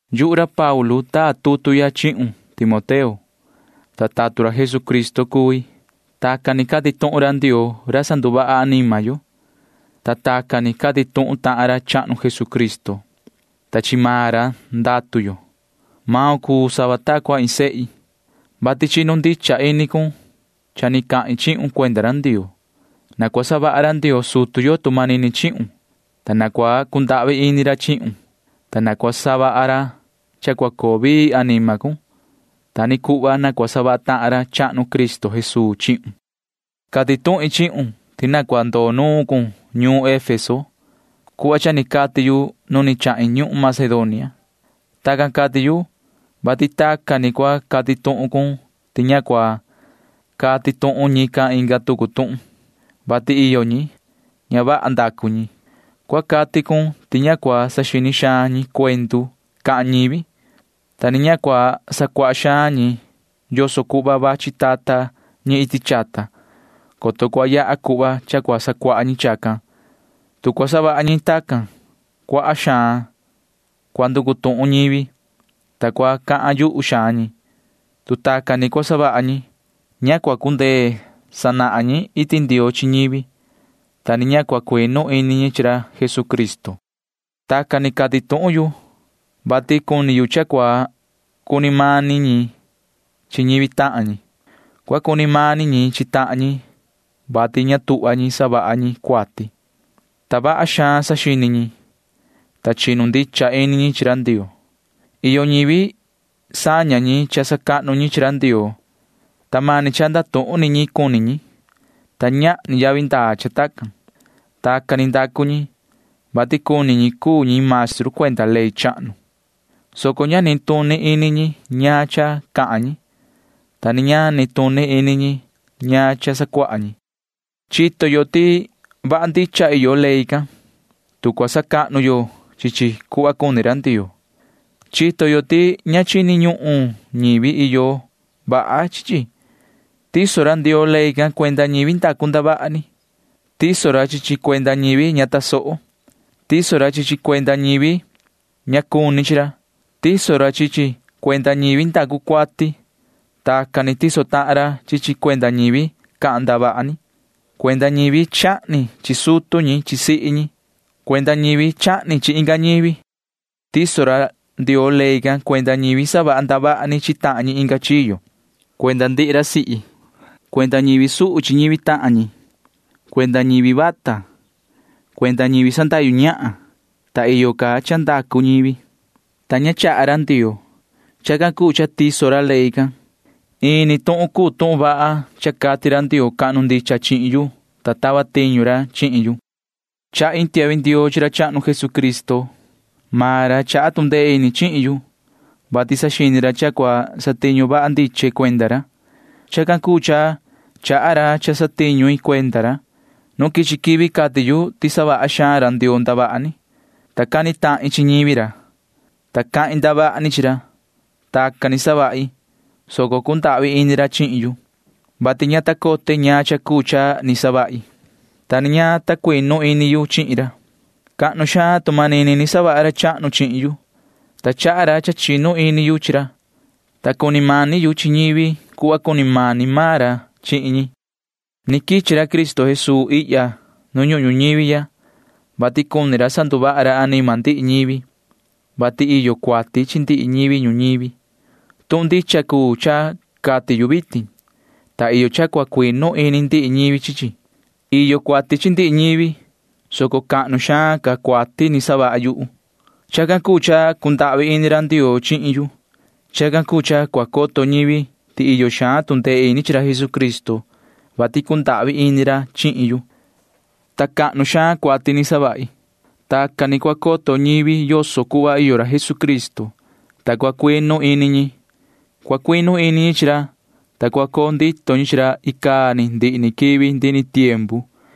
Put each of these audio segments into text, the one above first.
Yuhu ra Paulu taa tutu ya chihun, yoho Timoteo, ta tatun ra Jesucristo cui. Tacan ni cati tuhun ra Ndioo ra sanduvaha anima yo, ta tacan ni cati tuhun tahan ra chahnu Jesucristo, ta chi maan ra ndatu yo. Maun cuu sava ta cua iin sehi, vati chinu ndicha ini cun cha ni cahin chihun cuenda ra Ndioo. Na cua savaha ra Ndioo sutu yo tu manini chihun, ta na cua cundahvi ini ra chihun, ta na cua savaha ra cha cua coo vii anima cun. Ta ni cuhva na cua savaha tahan ra chahnu Cristo Jesuu chihun. Cati tuhin chihun ti na cua ndoo nuun cun ñuun Efeso cuhva cha ni cati yu nu ni chahin ñuhun Macedonia. Tacan cati yu, vati tacan ni cua cati tuhun cun ti ña cua cati tuhun ñican inga tucu tuhun, vati iyo ñi―ña vaha ndacu ñi. Cua cati cun ti ña cua saxini xaan ñi cuendu cahan ñivi, ta ni ña cua sacuaha xaan ñi yoso cuhva vachi tata ñi iti chata, coto cua yaha cuhva cha cua sacuaha ñi chacan. Tu cua savaha ñi tacan, cuaha xaan cua nducu tuhun ñivi, ta cua cahan yuhu xaan ñi. Tu tacan ni cua savaha ñi, ña cua cundee sanahan ñi iti Ndioo chi ñivi, ta ni ña cua cuinu ini ñi chi ra Jesucristo. Tacan ni cati tuhun yu, vati cuni yu cha cua cuni mani ñi chi ñivi tahan ñi. Cua cuni mani ñi chi tahan ñi, vati ña tuhva ñi savaha ñi cuati, ta vaha xaan saxini ñi, ta chinu ndicha ini ñi chi ra Ndioo. Iyo ñivi saña ñi cha sacahnu ñi chi ra Ndioo, ta mani cha ndatuhun ni ñi cuni ñi, ta ñahni yavi ndaa cha tacan. Tacan ni ndacu ñi, vati cuni ñi cuu ñi maestru cuenda ley chahnu, soco ña nituni ini ñi ñaan cha cahan ñi, ta ni ña nituni ini ñi ñaan cha sacuaha ñi. Chito yo ti vaha ndicha iyo ley can, tu cua sacahnu yo chi chi cuhva cuni ra Ndioo. Chito yo ti ña chini ñuhun ñivi iyo vaha chi chi. Tiso ra Ndioo ley can cuenda ñivi ndacu ndavaha ni. Tiso ra chi chi cuenda ñivi ña tasoho. Tiso ra chi chi cuenda ñivi ña cuni chi ra. Tiso ra chi chi cuenda ñivi ndacu cuati. Tacan ni tiso tahan ra chi chi cuenda ñivi cahan ndavaha ni, cuenda ñivi chahni chi sutu ñi chi sihi ñi, cuenda ñivi chahni chi inga ñivi. Tiso ra Ndioo ley can cuenda ñivi savaha ndavaha ni chi tahan ñi inga chiyo, cuenda ñivi putu, cuenda ñivi suhu chi ñivi tahan ñi, cuenda ñivi vata, cuenda ñivi sandahyu ñahan, ta iyo ca cha ndacu ñivi, ta ña chaha ra Ndioo. Chacan cuu cha tiso ra ley can. Ini tuhun cuu tuhun vaha cha cati ra Ndioo cahnu ndicha chihin yu, ta tava tiñu ra chihin yu. Chahi iin tiahvi ndioo chi ra chahnu Jesucristo. Maan ra chaha tu ndee ini chihin yu, vati saxini ra cha cua satiñu vaha ndiche cuenda ra. Chacan cuu cha chaha ra cha satiñu i cuenda ra. Nu quichi quivi cati yu ti savaha xaan ra Ndioo ndavaha ni, ta cani tahin chi ñivi ra, ta cahin ndavaha ni chi ra. Tacan ni savahi, soco cundahvi ini ra chihin yu, vati ña ta cote ñaan cha cuu cha ni savahi, ta ni ña ta cuinu ini yu chihin ra. Cahnu xaan tu manini ni savaha ra chahnu chihin yu, ta chaha ra cha ni chinu ini yu chi ra, ta cuni mani yu chi ñivi cuhva cuni mani maan ra chihin ñi. Ni quichi ra Cristo Jesuu ihya nu ñuhun ñuñivi ya, vati cuni ra sanduvaha ra anima ndihi ñivi, vati iyo cuati chi ndihi ñivi ñuñivi. Tuhun ndicha cuu cha cati yu vitin, ta iyo cha cua cuinu ini ndihi ñivi chi chi. Iyo cuati chi ndihi ñivi, soco cahnu xaan ca cuati ni savaha yu. Chacan cuu cha cundahvi ini ra Ndioo chihin yu. Chacan cuu cha cua coto ñivi ti iyo xaan tu ndee ini chi ra Jesucristo, vati cundahvi ini ra chihin yu, ta cahnu xaan cuati ni savahi. Tacan ni cua coto ñivi yoso cuhva iyo ra Jesucristo, ta cua cuinu ini ñi. Cua cuinu ini ñi chi ra, ta cua coo ndito ñi chi ra icaa ni ndihi ni quivi ndihi ni tiempu.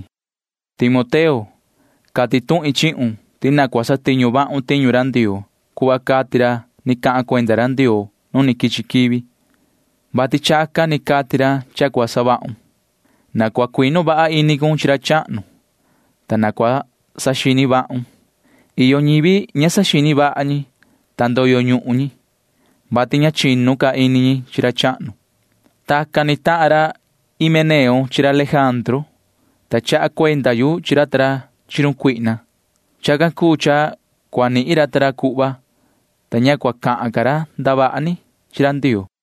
Yoho Timoteo, cati tuhin chihun ti na cua satiñu vahun tiñu ra Ndioo cuhva cati ra ni cahan cuenda ra Ndioo nu quichi quivi, vati chacan ni cati ra cha cua savahun. Na cua cuinu vaha ini cun chi ra chahnu, ta na cua saxini vahun. Iyo ñivi ña saxini vaha ñi, ta ndoyo ñuhun ñi, vati ña chinu ca ini ñi chi ra chahnu. Tacan ni tahan ra Himeneo chi ra Lejandru, ta chaha cuenda yu chi ra ta ra chi run Satanaa. Chacan cuu cha cua nihin ra ta ra cuhva, ta ña cua cahan ca ra ndavaha ni chi ra Ndioo.